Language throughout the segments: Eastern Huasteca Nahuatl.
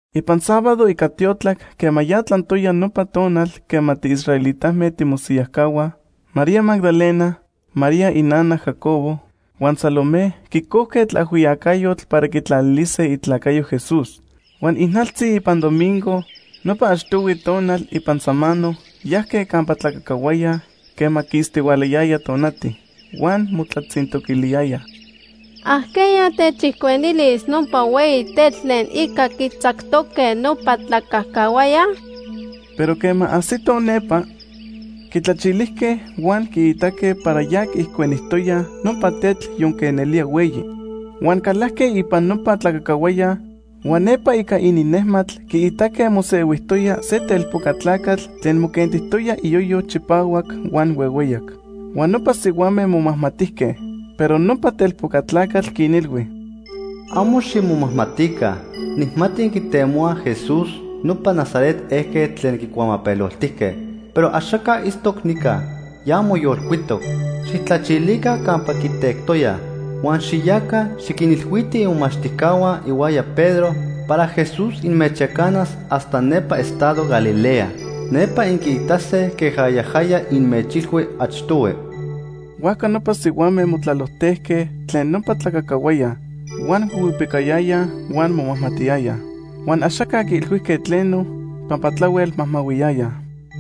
Ipan sábado ica tiotlac quema ya tlantoya nopa tonal quema tiisraelitame timosiyajcahuaj, María Magdalena, María inana Jacobo, huan Salomé quicojque tlaajhuiyacayotl para quitlalilise itlacayo Jesús. Huan ijnaltzi ipan domingo, nopa achtohui tonal ipan samano, yajque campa tlacacahuaya quema quistihualayaya tonati. Huan motlatzintoquiliyayaj: ―¿Ajqueya techijcuenilis nopa hueyi tetl tlen ica quitzactoque nopa tlacacahuaya? Pero quema ajsitoj nepa, quitlachilijque huan quiitaque para ya quiijcuenijtoyaj nopa tetl yonque nelía hueyi. Huan calajque ipan nopa tlacacahuaya, huan nepa ica ininnejmatl quiitaque mosehuijtoya se telpoca tlacatl tlen moquentijtoya iyoyo chipahuac huan huehueyac. Huan nopa sihuame momajmatijque. Pero nopa telpoca tlacatl quinilhui: ―Amo ximomajmatica. Nijmati inquitemohuaj Jesús, nopa Nazaret ejquetl tlen quicuamapeloltijque. Pero axaca itztoc nica, ya moyolcuitoc. Xijtlachilica campa quitectoyaj. Huan xiyaca, xiquinilhuitij imomachtijcahua ihuaya Pedro para Jesús inmechyacanas hasta nepa estado Galilea. Nepa inquiitase queja yajaya inmechilhui achtohui. Huajca nopa sihuame motlalojtejque tlen nopa tlacacahuaya, huan huihuipicayayaj huan momajmatiyayaj. Huan axaca quiilhuijque tleno pampa tlahuel majmahuiyayaj.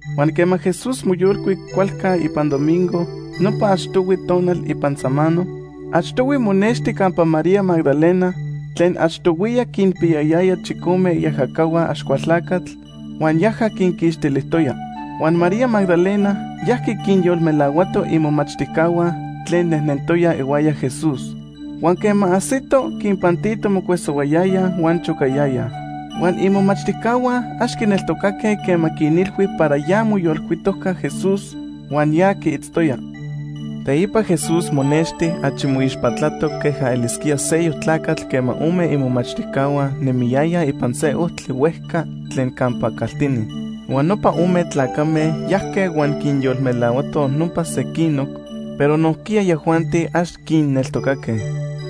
Huan quema Jesús moyolcuic cualca ipan domingo nopa achtohui tonal ipan samano, achtohui monexti campa María Magdalena tlen achtohuiya quinpiyayaya chicome iajacahua Axcualtlacatl huan yaja quinquixtilijtoya. Huan María Magdalena yajqui quinyolmelahuato imomachtijcahua tlen nejnentoyaj ihuaya Jesús. Huan quema ajsito, quinpantito mocuesohuayayaj huan chocayayaj. Huan imomachtijcahua ax quineltocaque quema quinilhui para ya moyolcuitojca Jesús huan ya quiitztoya. Teipa Jesús monexti achi moixpatlatoc queja elisquía seyoc tlacatl quema ome imomachtijcahua nemiyayaj ipan se ojtli huejca tlen campa caltini. Huan nopa ome tlacame yajque huan quinyolmelahuatoj nopa sequinoc, pero nojquiya yajuanti ax quinneltocaque.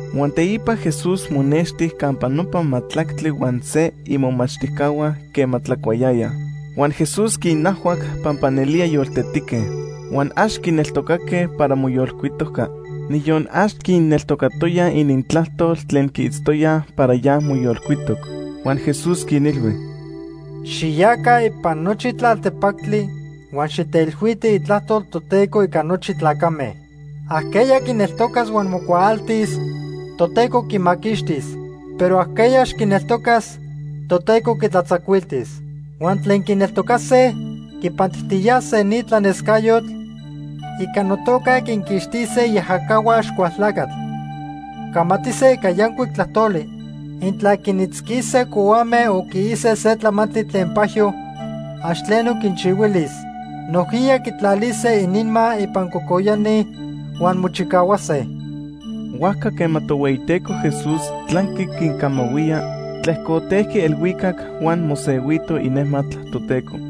Huan teipa Jesús monexti campa nopa majtlactli huan se imomachtijcahua quema tlacuayayaj. Huan Jesús quinajhuac pampa nelía yoltetique. Huan ax quineltocaque para moyolcuitojca. Niyon ax quinneltocatoyaj inintlajtol tlen quiitztoyaj para ya moyolcuitoc. Huan Jesús quinilhui: “Xiyaca ipan nochi tlaltepactli huan xiteilhuitij itlajtol Toteco ica nochi tlacame. Ajqueya quineltocas huan mocuaaltis, Toteco quimaquixtis. Pero ajqueya ax quineltocas, Toteco quitlatzacuiltis. Huan tlen quineltocase quipantijtiyase ni tlanescayotl: Ica notoca quinquixtise iajacahua Axcualtlacatl. Camatise ica yancuic tlajtoli. Intla quinitzquise cohuame o quiise se tlamantli tlen pajyo, ax tleno quinchihuilis. Nojquiya quitlalise ininma ipan cocoyani huan mochicahuase.” Huajca quema Tohueyiteco Jesús tlanqui quincamahuía, tlejcotejqui elhuicac huan mosehuito inejmatl Toteco.